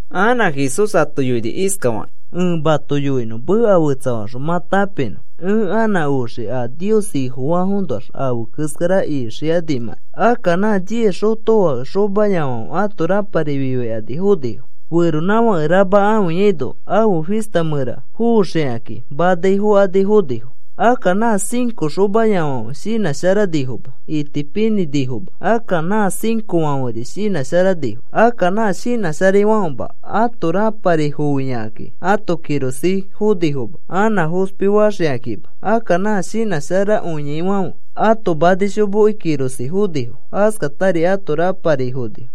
Anã Jesús ato yoini iskafakĩ: “Ẽ mato yoinõ meka fetsafaxõ mã tãpinõ ẽ anã oxii a Nios Ifofaafoõnoax afe keskara ixikanimãkai. Akka nã diez xotofake xomayafãfe ãto rãpari fifaikani fonifo. Feronãfãke rama ãfiyaino afe fista mẽra foxikakĩ manai fokani fonifo. Akka nã cinco xomayafãfe shinãsharanifoma, itipinĩnifoma. Akka nã cincofãferi shinãsharanifo. Akka nã shinãsharaifãfema ãto rãpari foiyakakĩ ãto kirosĩ fonifoma anã fospifaxikakima. Akka nã shinãsharakõiaifãfe ãto manishomoki kirosĩ fonifo. Askatari ãto rãpari fonifo.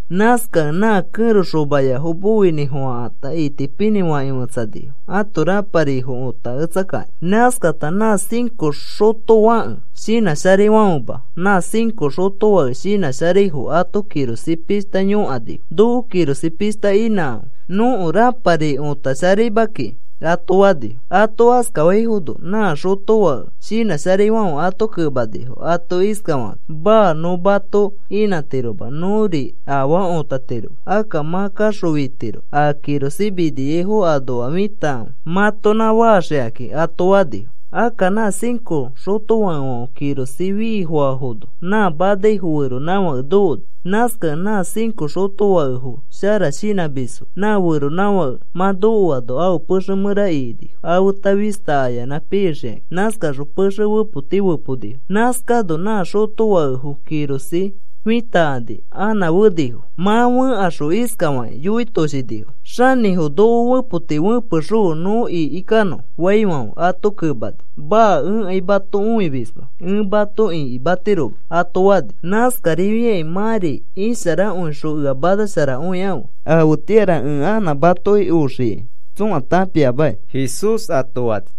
Nãskakẽ nã kẽro xomayafo moinĩfofãkata itipinĩ fakĩ fetsanifo ãto rãparifo õtaketsakakĩ. Nãskata nã cinco xotofake shinãsharaifãfema nã cinco xotofake shinãsharaifo ãto kirosĩ pishta yõkanifo: ‘Noko kirosĩ pishta inãkãfe. Nõko rãpari otasharaima kiki,’ ato fanifo. “Ato askafaifono nã xotofake shinãsharaifãfe ato kemanifo ato iskafakakĩ: ‘Maa. Nõ mato inãtiroma, nõri afaa otatiroma. Akka mã kaxõ fitiro a kirosĩ miniaifo anoa fitakãfe mãtonã faxikakĩ,’ ato fanifo. Akka nã cinco xotofakefãfe kirosĩ fiifofãfono nã manaifo feronãfake nokoni. Nãskakẽ nã cinco xotofakefo shara shinãmisfo nã feronãfake mã nokoaino afe pexe mẽra ikinifo afeta fista ayanã pixikãki. Nãskakaxõ pexe fepoti feponifo. Nãskano nã xotofakefo kirosĩ fitakani anã fenifo. Mã fẽkaxõ iskafakĩ yoitoshinifo: ‘Xanĩfo, noko fepoti fẽpexõfe nõ ikikanõ,’ faifãfe, ato kemani: ‘Maa. Ẽkai mato õimisma, ẽ mato ikimatiroma,’ ato fani. “Nãskarifiakĩ mãri isharakõixõ ea manasharakõikãfe. Afetĩara ẽ anã matoki oxikai tsõa tãpiamaki,” Jesús ato fani.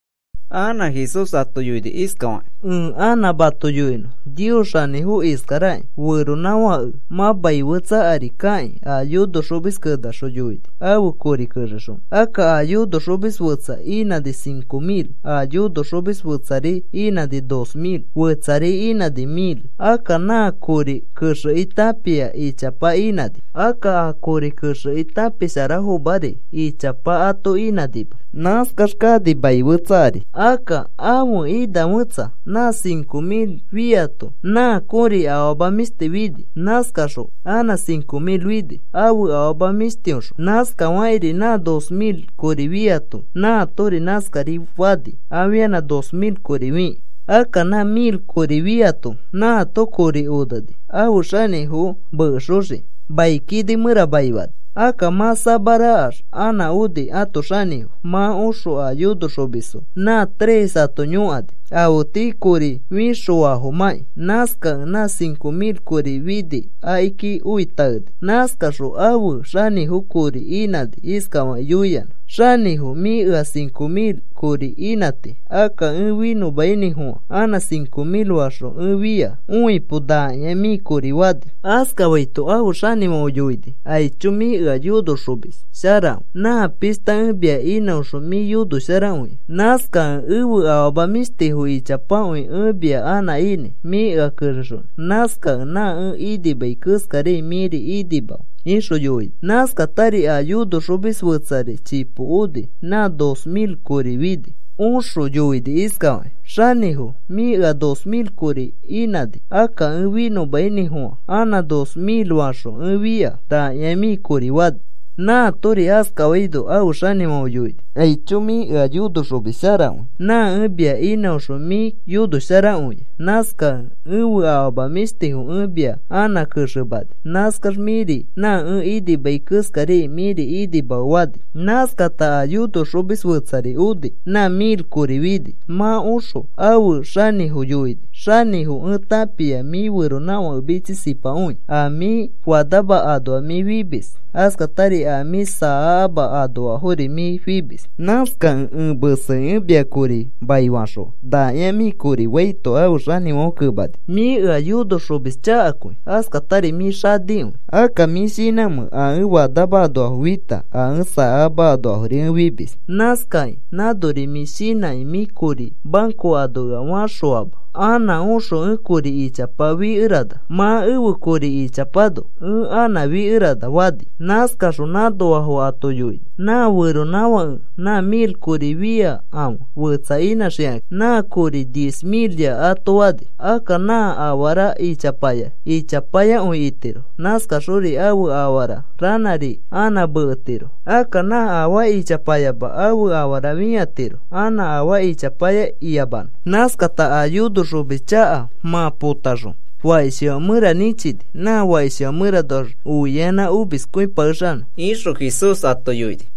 Anã Jesús ato yoini iskafakĩ: “Ẽ anã mato yoinõ Nios xanĩfo iskaraki. Feronãfake mã mai fetsa ari kakĩ a yonoxomis kenaxõ yoini ãfe kori kexexonõ. Akka a yonoxomis fetsa inãni cinco mil. A yonoxomis fetsari inãni dos mil, fetsari inãni mil. Akka nã kori kexekĩ tãpia ichapa inãni. Akka a kori kexekĩ tãpisharafomari ichapa ato inãnima. Nãskax kani mai fetsa ari. Akka ãfe ina fetsa nã cinco mil fiato nã kõri afama mĩshti fini. Nãskaxõ anã cinco mil fini ãfe afama mĩshtiõxõ. Nãskafakĩri nã dos mil kori fiato nãatori nãskarifani afianã dos mil kori fikĩ. Akka nã mil kori fiato nãato kori oneni ãfe xanĩfo mekexokĩ. Mai kini mẽra maifani. “Akka mã samarakax anã oni ãto xanĩfo. Mã oxõ a yonoxomisfo nã tres ato yõkani afe tii kori fixofafomãkĩ. Nãskakẽ nã cinco mil kori fini akiki oi taeni. Nãskaxõ ãfe xanĩfo kori inãni iskafakĩ yoiyanã: ‘Xanĩfo, mĩ ea cinco mil kori inãti. Akka ẽ finõmainĩfofã anã cinco mil faxõ ẽ fia. Õipo. Nakĩa mĩ kori,’ fani. “Askafaito ãfe xanĩfãfe yoini: ‘Aicho, mĩ ea yonoxomis sharakõi. Nã pishta ẽ mia inãoxõ mĩ yonosharakõia. Nãskakẽ ẽfe afama mĩshtifo ichapakõi ẽ mia anã inãi mĩ ea kexexonõ. Nãskakẽ nã ẽ inimai keskariai mĩri inimafe,’ ixõ yoini. “Nãskatari a yonoxomis fetsari chipo oni, nã dos mil kori fini. Oxõ yoini iskafakĩ: ‘Xanĩfo, mĩ ea dos mil kori inãni. Akka ẽ finõmainĩfofã anã dos mil faxõ ẽ fia. Nakĩa mĩ kori,’ fani. Nãatori askafaito ãfe xanĩfãfe yoini: ‘Aicho, mĩ ea yonoxomis sharakõi. Nã ẽ mia inãoxõ mĩ yonosharakõia. Nãskakẽ ẽfe afama mĩshtifo ẽ mia anã kexemani. Nãskax mĩri nã ẽ inimai keskariai mĩri inimafe,’ fani. “Nãskata a yonoxomis fetsari oni nã mil kori fini. Mã oxõ ãfe xanĩfo yoini: ‘Xanĩfo, ẽ tãpia mĩ feronãfake mitsisipakõi. A mĩ fanama anoa mĩ fimis. Askatari a mĩ saakama anoafori mĩ fimis. Nãskakĩ ẽ mesekĩ ẽ mia kori maifaxõa. Nakĩa mĩ kori,’ faito ãfe xanĩfãfe kemani: ‘Mĩ ea yonoxomis chakakõi. Askatari mĩ xanikõi. Akka, ¿mĩ shinãmẽ a ẽ fanama anoafo fita, a ẽ saakama anoafori ẽ fimis? Nãskakĩ nãnori mĩ shinãkĩ mĩ kori banco ano ea fãxõama anã oxõ ẽ kori ichapa fikerana mã ẽfe kori ichapano ẽ anã fikerana,’ fani. Nãskaxõ nã anoafo ato yoini: ‘Nã feronãfake nã mil kori fĩakãfe fetsa inãxikakĩ nã kori diez milya,’ ato fani. Akka nã afara ichapaya ichapayakõi itiro. Nãskaxori ãfe afara ranãri anã meketiro. Akka nã afaa ichapayama ãfe afara fĩatiro anã afaa ichapaya iyamanõ. Nãskata a yonoxomis chaka mã potaxõ fakishifã mẽra nĩchini nã fakishi mẽranoax oiaiyanã omiskõipakexanõ,” ixõ Jesús ato yoini.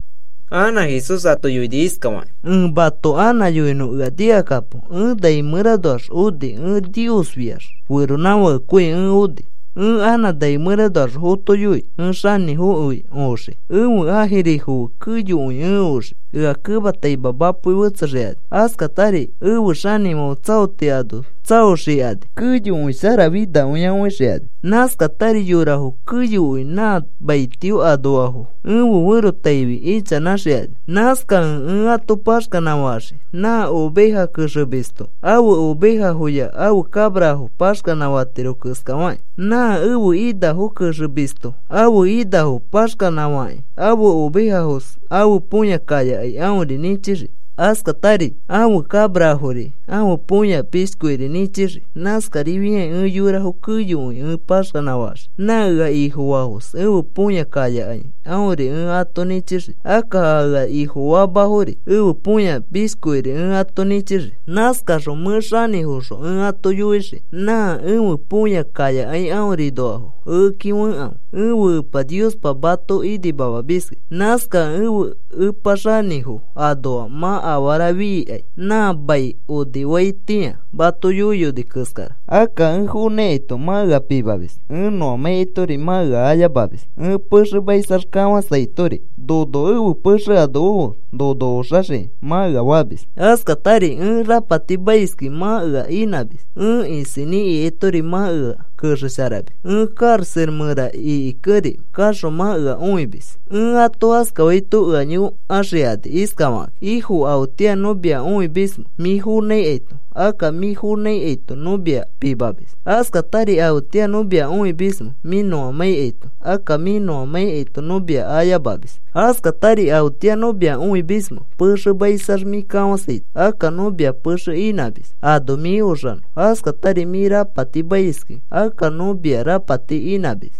Anã Jesús ato yoini iskafakĩ: “Ẽ mato anã yoinõ, ea nikakapo. Ẽ nai mẽranoax oni. Ẽ Niosfiax feronãfakekõi ẽ oni. Ẽ anã nai mẽranoax fotoyoi, ẽ xanĩfokõi oxii ẽfe ãjirifo fe keyokõi ẽ oxii, ea kemataima mapoi fetsexikani. Askatari efe xanĩfãfe tsaoti ano tsaoxikani. Keyokõi sharafinakõia õixikani. Nãskatari yorafo keyokõi nã maitio anoafo ẽfe ferotaifi ichanãxikani. Nãskakẽ ẽ ato paxkanã faxii nã oveja kexemisto ãfe ovejafoya ãfe cabrafo paxkanã fatiro keskafakĩ. Nã ãfe inafo kexemisto ãfe inafo paxkanã fakĩ ãfe ovejafos ãfe põya kayakai aõri nĩchixii. Askatari ãfe cabrafori ãfe põya mishkiori nĩchixii. Nãskarifiakĩ ẽ yorafo keyokõi ẽ paxkanã faxii. Nã ea Ifofaafos ẽfe põya kayakai aõri ẽ ato nĩchixii, akka a ea Ifofaafomafori ẽfe põya mishkiori ẽ ato nĩchixii. Nãskaxõ mẽ xanĩfoxõ ẽ ato yoixii nã ẽfe põya kayakai aõrinoafo ekeki fekãfe, ẽfe Epa Niospa mato inimamamiski. Nãskakẽ ẽfe Epa Xanĩfo anoa mã afara fikai nã mai onifaitĩa mato yoiyoni keskara. Akka ẽ fonãikaito mã ea pimamis; ẽ nõamãikaitori mã ea ayamamis; ẽ pexemaisax kafãsaitori, ‘Nono ẽfe pexe ano ofe nono oxaxiki,’ mã ea famis. Askatari ẽ rapatimaiskẽ mã ea inãmis; ẽ isinĩ ikaitori mã ea kexesharamis; ẽ karaxa mẽra ikikẽri kaxõ mã ea õimis. “Ẽ ato askafaito ea yõkaxikani iskafakãkĩ: ‘Ifo, ¿afetĩa nõ mia õimismẽ mĩ fonãikaito, akka mĩ fonãikaito nõ mia pimamis? Askatari, ¿afetĩa nõ mia õimismẽ mĩ nõamãikaito, akka mĩ nõimãikaito nõ mia ayamamis? Askatari, ¿afetĩa nõ mia õimismẽ pexemaisax mĩ kafasaito, akka nõ mia pexe inãmis ano mĩ oxanõ, askatari mĩ rapatimaiskẽ akka nõ mia rapati inãmis?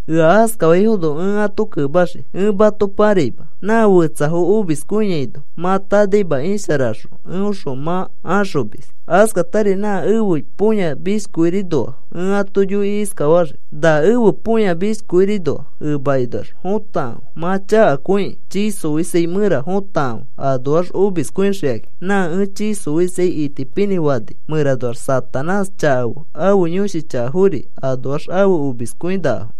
“Ea askafaifono ẽ ato kemaxii: ‘Ẽ mato paraima, nã fetsafo omiskõiaino mã tanaima isharaxõ eõxõ mã axomis.’ “Askatari na ẽfe põya mishkiorinoa ẽ ato yoikĩ iskafaxii: ‘Na ẽfe põya mishkiorinoa emakinoax fotakãfe mã chakakõikĩ. Chii xoisai mẽra fotakãfe anoax omiskõixikaki. Nã ẽ chii xoisai itipinĩ fani mẽranoax Satanás chaka fe ãfe yõshi chakafori anoax afe omiskõinakafo.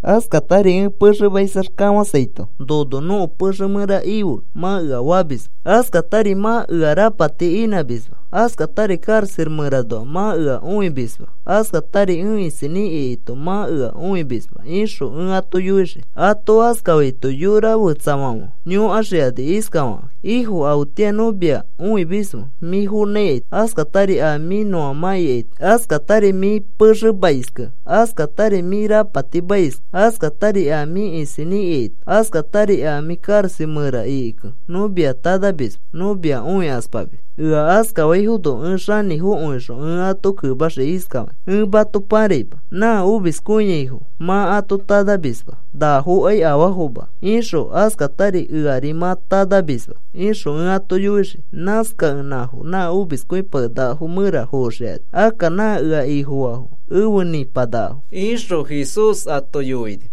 Askatari ẽ pexemaisax kafãsaito, “Nono nõko pexe mẽra ife,” mã ea famisma. Askatari mã ea rapati inãmisma. Askatari karaxa mẽranoa mã ea õikamisma. Askatari ẽ isinĩ ikaito mã ea õikamisma,’ ixõ ẽ ato yoixii. “Ato askafaito yorafetsafãfe yõkaxikani iskafakakĩ: ‘Ifo, ¿afetĩa nõ mia õimismẽ mĩ fonãikaito, askatari a mĩ nõiamãikaito, askatari mĩ pexemaiskẽ, askatari mĩ rapatimaiskẽ, askatari a mĩ isinĩ ikaito, askatari a mĩ karaxa mẽra ikikẽ nõ mia tanamisma nõ mia õikaspamis?’ “Ea askafaifono ẽ Xanĩfokõixõ ẽ ato kemaxii iskafakĩ: ‘Ẽ mato paraima. Nã omiskõiaifo mã ato tanamisma nafokai afaafoma ixõ askatari eari mã tanamisma,’ ixõ ẽ ato yoixii. Nãskakẽ nãfo nã omiskõipakenakafo mẽra foxikani. Akka nã ea Ifofaafo efe nĩpanakafo,” ixõ Jesús ato yoini.